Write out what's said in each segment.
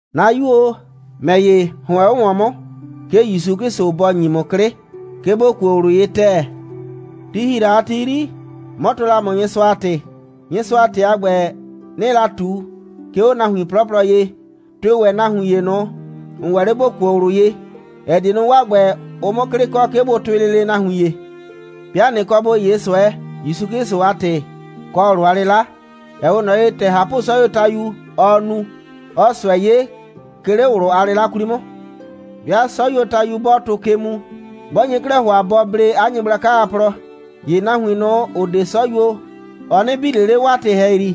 'Na 'yu o, ‑mɛ ‑ye, ‑hʋɛn 'o ‑wɔn 'mʋ, 'ke ‑Yusu 'Klɩsʋ bɔ ‑nyi ‑mʋ 'klɩ, 'ke ‑bo kuo ꞊wlʋ ye ‑tɛɛ. Ti ‑hi la a ti 'yri, 'mɔ tɔɔ la ‑mʋ Nyɩsʋa a ‑tɩ. Nyɩsʋa a ‑tɩ a ‑gbɛ, 'nɩɩ la ꞊tu, 'ke 'o nahuin 'plɔplɔ ye, tʋɩ ‑wɛ nahuin ‑ye ꞊nʋ, ‑n ‑wɛ 'le ‑bo kuo ꞊wlʋ ye, ‑ɛ die nu, 'waa ‑gbɛ, ʋ 'mʋ 'klɩ kɔ, 'ke bʋ tʋɩ lele nahuin ‑ye. 'Bɩa ꞊nɩ kɔ ‑bo 'ye ꞊sʋɛ, ‑Yusu 'Klɩsʋ a ‑tɩ, kɔ ꞊wlʋ a 'lɩla, ‑ɛ 'we ꞊nɔ ye, ‑tɛ ꞊hapʋ'sɔyuotayu, ɔɔ nu, 'ɔɔ ꞊sʋɛ 'ye, 'ke 'le ꞊wlʋ a 'lɩla 'kwli 'mʋ. 'Bɩa 'sɔyuotayu 'bɔɔ tʋ ke mu, 'bɔ nye 'klɛɛ ‑hʋa bɔ blee 'a nyɩgblaka a plɔ, ‑ye nahuin ꞊nʋ, ‑ʋ 'de 'sɔyuo, ɔ 'nɩ bi ꞊le 'le 'waa ‑tɩ ‑hɛyri.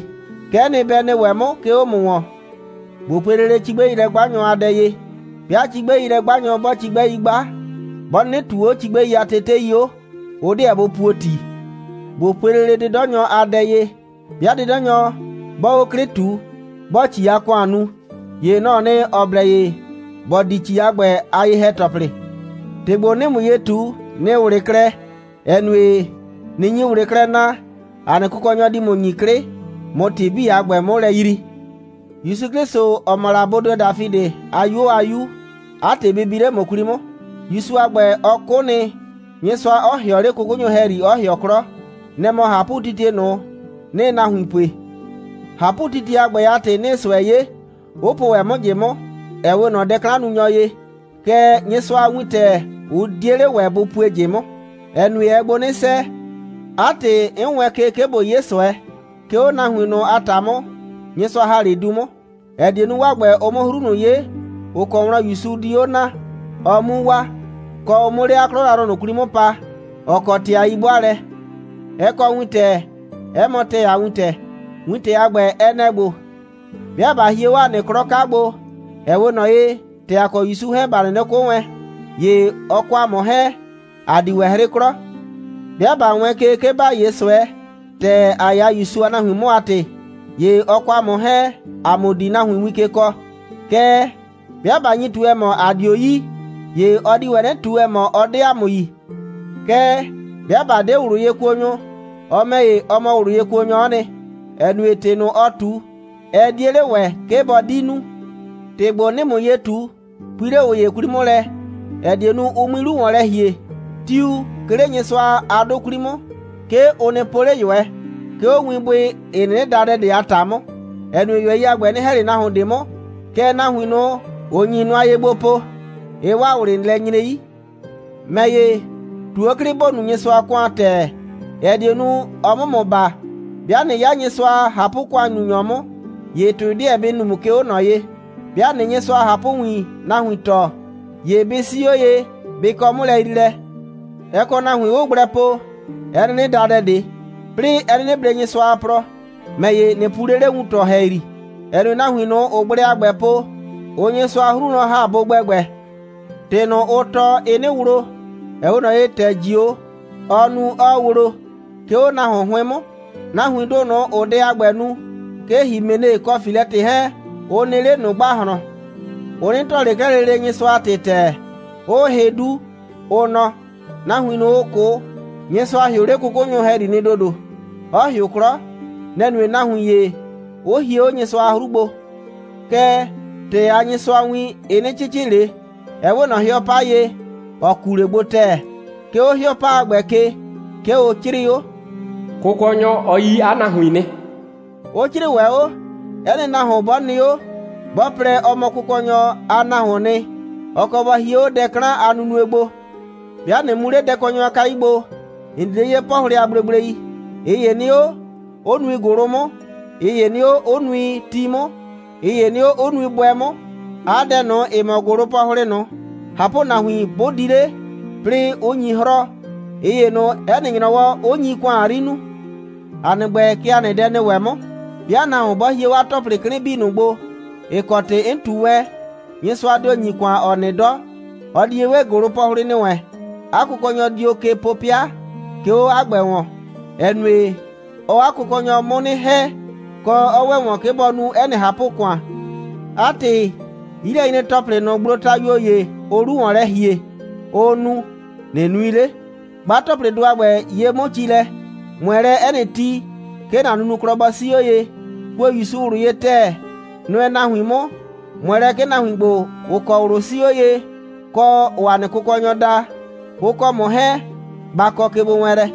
Kɛ'ɛ nɩ, bɛ nɩ ‑wɛ 'mʋ, 'ke 'o ‑mʋ wɔn. ꞊Bo pue lele cigbɛilɛ'gbanyɔ a dɛ ye. 'Bɩa cigbɛilɛ'gbanyɔ 'bɔɔ cigbɛi 'gba, 'bɔ 'nɩnɩ ꞊tuu 'o cigbɛi a tetei 'o, ʋ 'deɛ bʋ puo ‑ti. ꞊Bo pue lele 'dɩdɔnyɔ a dɛ ye. 'Bɩa 'dɩdɔnyɔ 'bɔɔ 'o 'klɩ ꞊tu, 'bɔɔ ‑ci a ‑kʋan nu, ‑ye nɔ‑ɔ nɩ, ‑ɔ blɛ ye ‑bɔ di ‑ci a ‑gbɛ a ye‑hɛ‑tɔplɩ. ‑Tɩ ‑gbo, 'nɩɩ ‑mʋ ye ꞊tu, nɩɩ ꞊wlɩ klɛ, ‑ɛ nue, ꞊nɩ nyi ꞊wlɩ klɛ naa, ‑a nɩ Kʋkɔnyɔ di ‑mʋ ‑nyi 'klɩ, ꞊mʋ ‑tɩ 'bii a ‑gbɛ 'mʋ lɛ yrii. ‑Yusu 'Klɩsʋ, ‑ɔ mɔ la bodɩɔ Dafidɩ a 'yuo a 'Yu, 'a ‑tɩ bɩ bi 'le ‑mʋ 'kwli 'mʋ. ‑Yusu a ‑gbɛ, ɔ 'kʋ nɩ, Nyɩsʋa 'ɔ ‑hɩɔ 'le 'kʋkʋnyʋ ‑hɛyri, 'ɔ ‑hɩɔ 'klɔ. Nɛ‑ mɔ ꞊hapʋtitie ꞊nʋ, 'nɩɩ nahuin pue. ꞊Hapʋtitie a ‑gbɛ a ‑tɩ, 'nɩɩ ꞊sʋɛ 'ye, 'ʋ po ‑wɛ 'mʋ ꞊jɩ 'mʋ, ‑ɛ 'we ꞊nɔ dɛ'klannunyɔ ye. Kɛɛ, Nyɩsʋa a wintɛ, ʋ 'die 'le ‑wɛ bʋ pue ꞊jɩ 'mʋ, ‑ɛ nue, ɛɛ gbo 'nɩ 'sɛɛ. 'A ‑tɩ, 'n wɛɛn ke, 'ke ꞊bo 'ye ꞊sʋɛ, 'ke 'o nahuin ꞊nʋ a ‑ta 'mʋ, Nyɩsʋa ‑ha 'le du 'mʋ, ‑ɛ die nu, 'waa ‑gbɛ, ʋ 'mʋ 'hru ꞊nʋ 'ye, ‑ʋ kɔ wlɔn ‑Yusu di 'o naa, ɔ 'mu waa, kɔ, ʋ 'mʋ 'le 'a 'klɔ yrayrʋ ꞊nʋ 'kwli 'mʋ pa, ‑ɔ kɔ ‑tɩ a 'yi'bʋaalɛ. Ɛ kɔ wintɛ, 'ɛ mɔ ‑tɛɛ a wintɛ. Wintɛ a ‑gbɛ, ɛ nɛ‑ ‑gbo: «'Bɩa ꞊ba hie 'o ‑a nɩ 'klɔ 'ka gbo, ‑ɛ 'we ꞊nɔ ye, ‑tɛ ‑a kɔ ‑Yusu 'hɛɛn, ‑ba 'nɩnɩ 'kʋ wɛn, ‑ye ɔ kɔ ‑a mʋ 'hɛɛn, ‑a di ‑wɛ 'hrɩ 'klɔ. 'Bɩa ꞊ba wɛɛn ke, 'ke ‑ba 'ye ꞊sʋɛ, ‑tɛ ‑a 'ya ‑Yusu a nahuin 'mʋ a ‑tɩ, ‑ye ɔ kɔ ‑a mʋ 'hɛɛn, ‑a mʋ di nahuin win ke kɔɔ. Kɛɛ, 'bɩa ꞊ba nyi ꞊tu, ‑ɛ mɔ, ‑a 'dio yi, ‑ye ɔ di ‑wɛ 'nɩ ꞊tu, ‑ɛ mɔ, ɔ 'de ‑a mʋ yi. Kɛɛ, 'bɩa ꞊ba 'de ꞊wlʋyekuonyʋ, ɔ ‑mɛ ‑ye, ɔ mɔ ꞊wlʋyekuonyɔ'ɔ nɩ, ‑ɛ nue, ‑tɩ ꞊nʋ, ɔɔ ꞊tu, ɛ 'die 'le ‑wɛ, 'ke bɔ 'di nu.» ‑Tɩ ‑gbo, 'nɩɩ ‑mʋ ye ꞊tu, pui 'le ꞊ʋ ‑ye 'kwli 'mʋ lɛ, ‑ɛ die nu, ʋ 'mui 'lu ‑wɔn lɛ ‑hie. Tiu, 'ke 'le Nyɩsʋa a 'dʋ 'kwli 'mʋ, 'ke ʋ nɩ po 'le ꞊yʋɛ, 'ke 'o winbʋɩ, ‑ɩ 'nɩnɩ da dɛ ꞊de a ‑ta 'mʋ, ‑ɛ nue, ꞊yʋɛi a ‑gbɛ, ɩ 'nɩ ‑hɛ ꞊le nahuon ꞊de 'mʋ, kɛɛ, nahuin ꞊nʋ, ‑ʋ nyi nʋa ye gbo po, ɩɩ 'waa ꞊wlɩ lɛ nyre 'yi. ‑Mɛ ‑ye, ꞊tu 'o 'klɩ, ‑bo nu Nyɩsʋa a ‑kʋan ‑tɛɛ, ‑ɛ die nu, ɔ 'mʋ ‑mʋ baa. 'Bɩa ꞊nɩ 'ya Nyɩsʋa a ꞊hapʋ‑kʋannunyɔ 'mʋ, ‑ye ‑tʋɩ 'deɛ bɩ nu ‑mʋ, 'ke 'o ꞊nɔ ye. 'Bɩa ꞊nɩɩ Nyɩsʋa a ꞊hapʋwin nahuin tɔɔ, ‑ye bɩ 'sii 'o ye, bɩ kɔ 'mʋlɛyriilɛ. Ɛ kɔ nahuin, 'ʋʋ gblɛ po, ‑ɛ 'nɩnɩ da dɛ ꞊de, 'plɩɩ ‑ɛ 'nɩnɩ blee Nyɩsʋa a plɔ. ‑Mɛ ‑ye, ꞊nɩ pu 'le 'le wuntɔ ‑hɛyri, ‑ɛ nue, nahuin ꞊nʋ, ‑ʋʋ gblɛ a ‑gbɛ po, ʋʋ Nyɩsʋa a 'hru wlɔn ‑ha bʋ gbɛgbɛ. ‑Tɩ ꞊nʋ, ʋʋ tɔɔ, ɩɩ 'nɩ wlo, ‑ɛ 'we ꞊nɔ ye, ‑tɛ ꞊jio, ɔɔ nu, 'ɔɔ wlo, 'ke 'o nahuon 'hʋɩn 'mʋ. Nahuindʋ ꞊nʋ, ‑ʋʋ dɛ a ‑gbɛ nu, 'ke Himene kɔ Filɛtɩ 'hɛɛn, ʋ nɩ 'le ꞊nʋ ‑gbahlɔn. Ʋ 'nɩ tɔɔ ꞊le 'klɛɛ lele Nyɩsʋa a ‑tɩ a ‑tɛɛ, 'ʋʋ hɩ 'du, ʋ nɔ, nahuin ꞊nʋ, ‑ʋ 'kʋ, Nyɩsʋa ‑hɩʋ 'le 'kʋkʋnyʋ ‑hɛyri nɩ ‑dodo, 'ɔ ‑hɩʋ 'klɔ. Nɛ‑ nue, nahuin ‑ye 'ʋ hie 'o Nyɩsʋa a 'hru gbo. Kɛɛ, ‑tɛɛ a Nyɩsʋa a win, ɩ 'nɩ 'cɩcɩ ꞊le, ɛ 'we ꞊nɔ 'hɩɔ 'pa ye, ‑ɔ kuu 'le gbo ‑tɛɛ. 'Ke 'o 'hɩɔ 'pa a ‑gbɛ ke, 'ke ʋ 'crɩɩ 'o: «Kʋkɔnyɔ, ɔ yi 'a nahuin nɩ,» 'ʋ 'crɩɩ ‑wɛ 'o: «'Ɛ nɩ nahuon 'bɔ nɩ 'o, 'bɔ plɛ, ɔ mɔ Kʋkɔnyɔ a nahuoon nɩ, ɔ kɔ bɔ hie 'o dɛ 'klan a nunue gbo.» 'Bɩa ꞊nɩ mu 'le dɛkɔnyɔ a kayu gbo, ‑n di 'le 'yee 'pɔhlɩ a gblegblei. ꞊Ɩ ‑ye nɩ 'o, 'ʋ nui ‑gʋlʋ 'mʋ, ꞊ɩ ‑ye nɩ 'o, 'ʋ nui ti 'mʋ, ꞊ɩ ‑ye nɩ 'o, 'ʋ nui bʋɛ 'mʋ. 'A dɛ ꞊nʋ, ‑ɩ mɔ ‑gʋlʋpɔhlɩ ꞊nʋ, ꞊hapʋnahuin 'bʋ di 'le, 'plɩɩ 'ʋ nyi 'hrɔɔ, ꞊ɩ ‑ye ꞊nʋ, 'ɛ nɩ ‑nyrɔwɔ, 'ʋ nyi ‑kʋan 'yri nuu. ‑A nɩ ‑gbɛ, kɛ ‑a nɩ dɛ nɩ ‑wɛ 'mʋ. 'Bɩa nahuon 'bɔ hie 'o ‑tɔplɩ 'klɩn 'bii ꞊nʋ gbo, ‑ɩ kɔ ‑tɩ 'n ꞊tu wɛn, Nyɩsʋa dio ‑nyi ‑kʋan, ‑ɔ nɩ 'dɔ. Ɔ di ye 'we ‑gʋlʋpɔhlɩ ‑nɩ wɛn. 'A kʋkɔnyɔ dio ke po 'pɩa, 'ke 'o 'a ‑gbɛ ‑wɔn, ‑ɛ nue, ɔɔ 'a kʋkɔnyɔ 'mʋ 'nɩ ‑hɛ, kɔ, 'ɔ ‑wɛ ‑wɔn, 'ke bɔ nu 'ɛ nɩ ꞊hapʋ‑kʋan. 'A ‑tɩ, 'yilɛnyre‑tɔplɩ ꞊nʋ, gblotayuo ‑ye, ʋʋ 'lu ‑wɔn lɛ ‑hie, ʋʋ nu, ꞊nɩ nui 'le. 'Gba ‑tɔplɩdʋ a ‑gbɛ ye 'mʋ ci lɛ. ꞊Mʋɛ lɛ 'ɛ nɩ ti, 'ke ‑na nunuklɔ bɔ 'sii 'o ye. Kuo ‑Yusu ꞊wlʋ ye ‑tɛɛ. Nʋɛ nahuin 'mʋ. ꞊Mʋɛ lɛ, 'ke nahuin ‑gbo, ‑ʋ kɔ ꞊wlʋ 'sii 'o ye, kɔ, ‑ʋʋ ‑a nɩ Kʋkɔnyɔ da, ʋ kɔ ‑mʋ 'hɛɛn, ba kɔ kegbowɛɛnlɛ.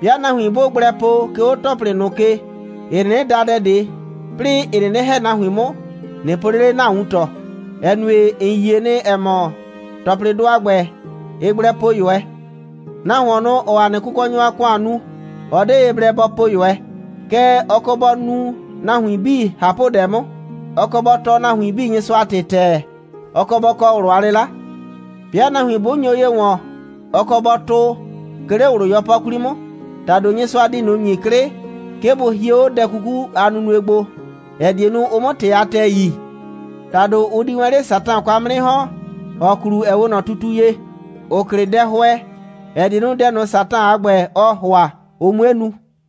'Bɩa nahuin 'bʋʋ gblɛ po, 'ke 'o ‑tɔplɩ ꞊nʋ ke, ‑ɩ 'nɩnɩ da dɛ ꞊de, 'plɩɩ, ‑ɩ 'nɩnɩ ‑hɛ nahuin 'mʋ, ꞊nɩ po 'le 'le ‑na wuntɔ, ‑ɛ nue, ‑n yie nɩ, ‑ɛ mɔ, ‑tɔplɩdʋ a ‑gbɛ, ɩɩ gblɛ po ꞊yʋɛ. Nahuon ꞊nʋ, ‑ɔɔ ‑a nɩ Kʋkɔnyɔ a ‑kʋan nu, ɔ 'de ye blɛ bɔ po ꞊yʋɛ. Kɛɛ, ɔ kɔ bɔ nu nahuin 'bii ꞊hapʋdɛ 'mʋ. Ɔ kɔ bɔ tɔɔ nahuin 'bii Nyɩsʋa a ‑tɩ ‑tɛɛ. Ɔ kɔ bɔ kɔ ꞊wlʋ a 'lɩla. 'Bɩa nahuin 'bʋ nyo ye ‑wɔn, ɔ kɔ bɔ tʋʋ, 'ke 'le ꞊wlʋ 'yɔpɔ 'kwli 'mʋ. ‑Tado Nyɩsʋa di ꞊nʋ ‑nyi 'klɩ, 'ke bʋ hie 'o dɛ 'kuku a nunue gbo, ‑ɛ die nu, ʋ 'mʋ ‑tɩ a ‑tɛɛ yi. ‑Tado ʋ di wɛn 'le Satan kwa 'mʋ 'nɩ ‑hɔn, ‑ɔ klu, ‑ɛ 'we ꞊nɔ tutu ye, ‑ʋ klɩ dɛhʋɛ, ‑ɛ die nu, dɛ ꞊nʋ, Satan a ‑gbɛ, ɔɔ ‑hʋa, ʋ 'mue nu.